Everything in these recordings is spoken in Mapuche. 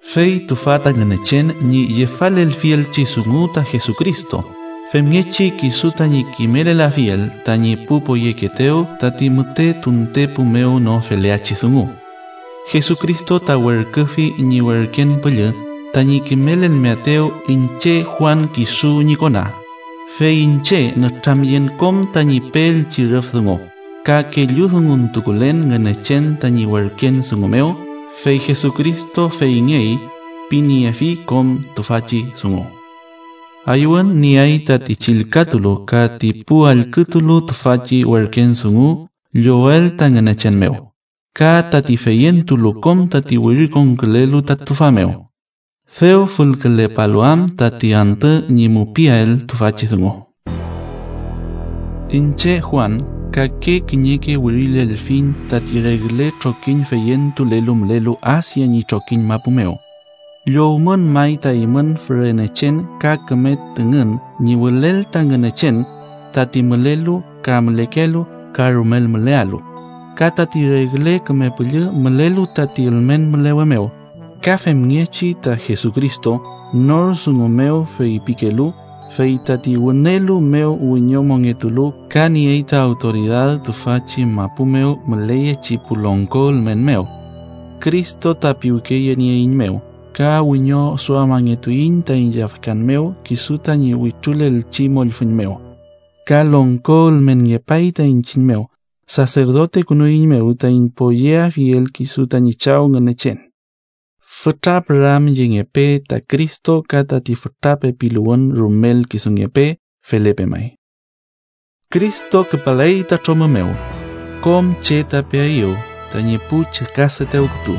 Fey tüfa ta Ngünechen ñi yefalelfielchi dungu ta Jesucristo, femngechi kisu tañi kimelelafiel tañi pu poyekeetew tati müte tuntepu mew no feleachi dungu. Jesucristo ta werküfi ñi werken püllü tañi kimelelmeaetew iñche Juan kisu ñi kona, fey iñche nütramyen kom tañi peelchi rüf dungu, ka kelludunguntukulen Ngünechen tañi werken dungungen mew, fey Jesucristo feyngey piniefi kom tüfachi dungu. Ayüwün nieay tati chillkatulu ka ti pu allkütulu tüfachi werken dungu llowel ta Ngünechen mew, ka tati feyentulu kom tati wirikonkülelu ta tüfa mew, dew fülkülepalu am tati antü ñi mupiael tüfachi dungu. Iñche Juan, kake kiñeke wirilelfiñ tati regle trokiñ feyentulelu mülelu Asia ñi trokiñ mapu mew. Llowmün may ta eymün fürenechen ka küme tüngün ñi wülel ta Ngünechen tati mülelu ka mülekelu ka rumel mülealu, ka tati regle küme püllü mülelu tati ülmen mülewe mew, ka femngechi ta Jesucristo, nor dungu mew feypikelu, fey tati wünelu mew wiñomongetulu ka niey ta awtoridad tüfachi mapu mew müleyechi pu longko ülmen mew. Cristo ta piwkeyenieeiñmew, ka wiñoduamangetuiñ taiñ yafkan mew kisu tañi wütrulelchi mollfüñ mew. Ka longko ülmenngepay ta iñchiñ mew. Saserdotekünueiñmew taiñ poyeafiel kisu tañi Chaw ka ñi Ngünechen. ¡Fütra püramyengepe ta Cristo ka tati fütra pepiluwün rumel kisungepe! Felepe may. ¡Cristo küpaley ta tromü mew! Kom che ta peaeyew, tañi pu chükadetew kütu,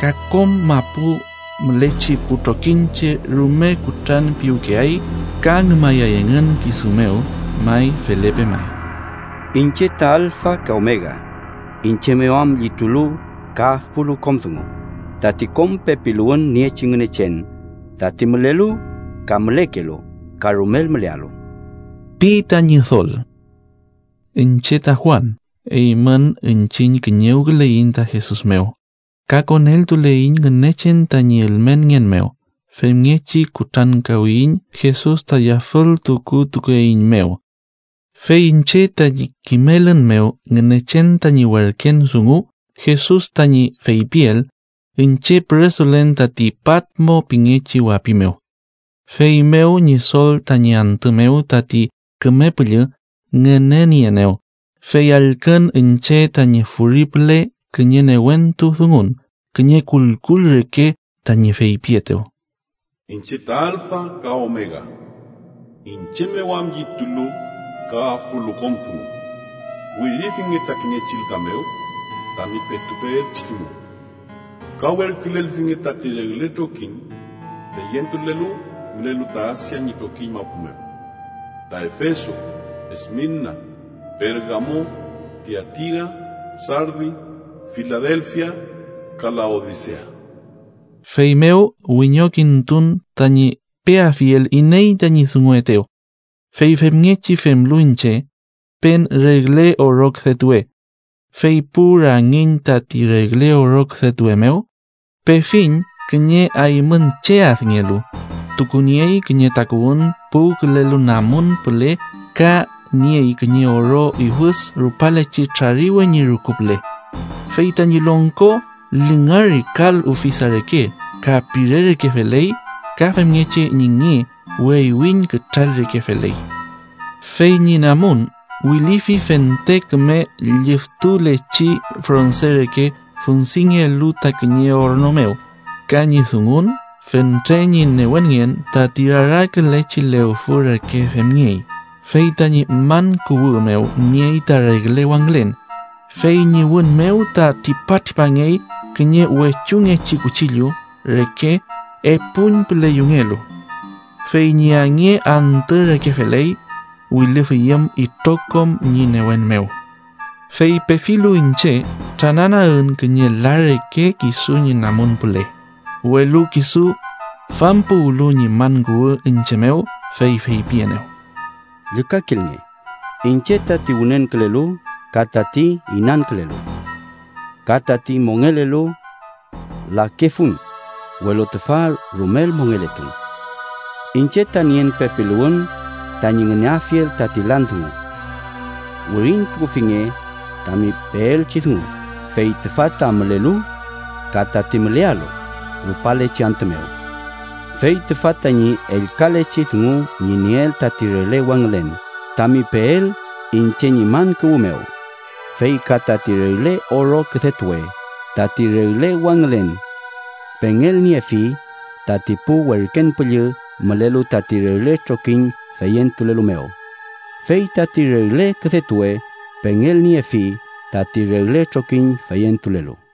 ka kom mapu mülechi pu trokiñche rume kutrantupiwkeay ka ngümayay engün kisu mew. May, felepe may. “Iñche ta alfa ka omega, iñche mew am llitulu ka afpulu kom dungu, tati kom pepiluwün niechi Ngünechen, tati mülelu ka mülekelu ka rumel mülealu” pi ta Ñidol. Iñche ta Juan, eymün iñchiñ kiñewküleiñ ta Jesus mew, ka koneltuleiñ Ngünechen tañi ülmenngen mew, femngechi kutrankawiyiñ Jesus ta yafültukutukeeiñmew. Fey iñche tañi kimelün mew Ngünechen tañi werken dungu Jesus tañi feypiel, iñche püresulen tati Patmo pingechi wapi mew. Feymew Ñidol tañi antü mew tati Küme Püllü ngünenieenew, fey allkün iñche tañi furi püle kiñe newentu dungun, kiñe kullkull reke, tañi feypietew: “Iñche ta alfa ka omega, iñche mew am llitulu ka afpulu kom dungu. Wirifinge ta kiñe chillka mew tami petu peelchi dungu, ka werkülelfinge tati regle trokiñ feyentulelu mülelu ta Asia ñi trokiñ mapu mew: ta Efeso, Esmirna, Pergamo, Tiatira, Sardi, Filadelfia ka Laodisea.” Feymew wiñokintun tañi peafiel iney tañi dunguetew, fey femngechi femlu iñche, pen regle oro küdetuwe, fey pu rangiñ tati regle oro küdetuwe mew, pefiñ kiñe aymüñ che adngelu, tukuniey kiñe takuwün puwkülelu namun püle ka niey kiñe oro iwüd rupalechi trariwe ñi rüku püle. Fey tañi longko lingari kal ufisa reke, ka pire reke feley, ka femngechi ñi nge weywiñ kütral reke feley. Fey ñi namun wilüfi fente küme liftulechi fronse reke fundingelu ta kiñe orno mew, ka ñi dungun fentre ñi newenngen tati rarakülechi lewfü reke femngey. Fey tañi man kuwü mew niey ta regle wangülen, fey ñi wün mew ta tripatripangey kiñe wechuñngechi kuchillu reke epuñpüle yungelu. Fey ñi ange antü reke feley, wilüfüyüm itrokom ñi newen mew. Fey pefilu iñche, trananagün kiñe la reke kisu ñi namun püle. Welu kisu fampuwüli ñi man kuwü iñche mew, fey feypienew: “Llükakilnge. Iñche tati wünenkülelu ka tati inankülelu, ka tati mongelelu. Lakefun, welu tüfa rumel mongeletun. Iñche ta nien pepiluwün tañi ngüneafiel tati lan dungu. “Wirintukufinge tami peelchi dungu, fey tüfa ta mülelu ka tati mülealu rupalechi antü mew. Fey tüfa tañi ellkalechi dungu ñi nien tati regle wangülen tami peel iñche ñi man kuwü mew, fey ka tati regle oro küdetuwe: tati regle wangülen pengelniefi tati pu werken püllü mülelu tati regle trokiñ feyentulelu mew, fey tati regle küdetuwe pengelniefi tati regle trokiñ feyentulelu.